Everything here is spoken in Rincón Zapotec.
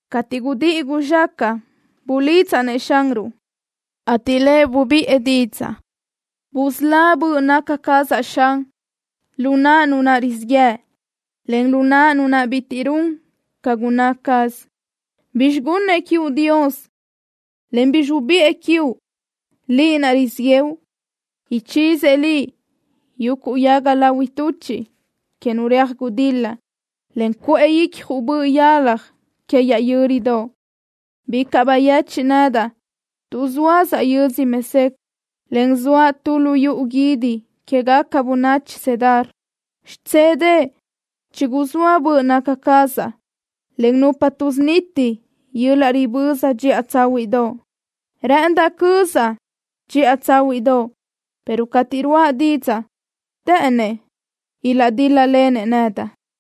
Cateʼ gudíʼi guzxácaʼa bulidzaʼ-nëʼ Xanruʼ, ateʼ Lëʼ bubiʼë didzaʼ. Busölá böʼ naca cazaʼ, Xan, lu naʼ nu rizíʼ yëʼ, en lu naʼ nu bitiʼ run ca gunná caz. ¿Bizxi gunëʼ quiuʼ Dios, en bizxi ubiʼë quiuʼ, liʼ naʼ rizíʼ yëʼu? Ichizëʼ liʼ yuguʼ yaga lahui tuchiʼ que nu reaj gudil-la, en cuʼë icjuʼ boʼ yalaj que yaʼ yö́ridoʼ. Bicaʼ bayechiʼ nedaʼ tuʼ zóasaʼ yödzö Mesec, en zoaʼ tu lu yuʼu guídi quégaca bönachi Cedar. Xidzélëʼë chiguzóa böʼ naca cazaʼ len nupa tuʼsuniti yöl-laʼ riböza dxiʼa tsáhuiʼdoʼ. Rë́ʼëndaʼ cözaʼ dxiʼa tsáhuiʼdoʼ, pero cateʼ ruáʼa didzaʼ të́ʼënnëʼ ilaʼdíl-lalen nedaʼ.